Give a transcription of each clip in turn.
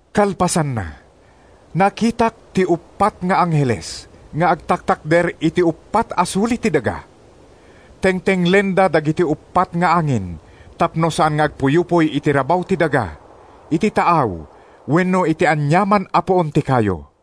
Kalpasanna, nakitak ti uppat nga angheles nga agtaktakder iti uppat a suli ti daga. Tengtenglenda dagiti uppat nga angin tapno saan nga agpuyupoy iti rabaw ti daga, iti taaw wenno iti aniaman a puon ti kayo.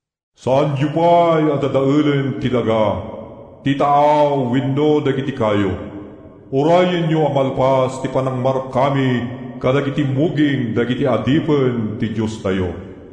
“Saanyo pay a dadaelen ti daga, ti taaw wenno dagiti kayo; urayenyo a malpas ti panangmarkami kadagiti muging dagiti adipen ti Diostayo.”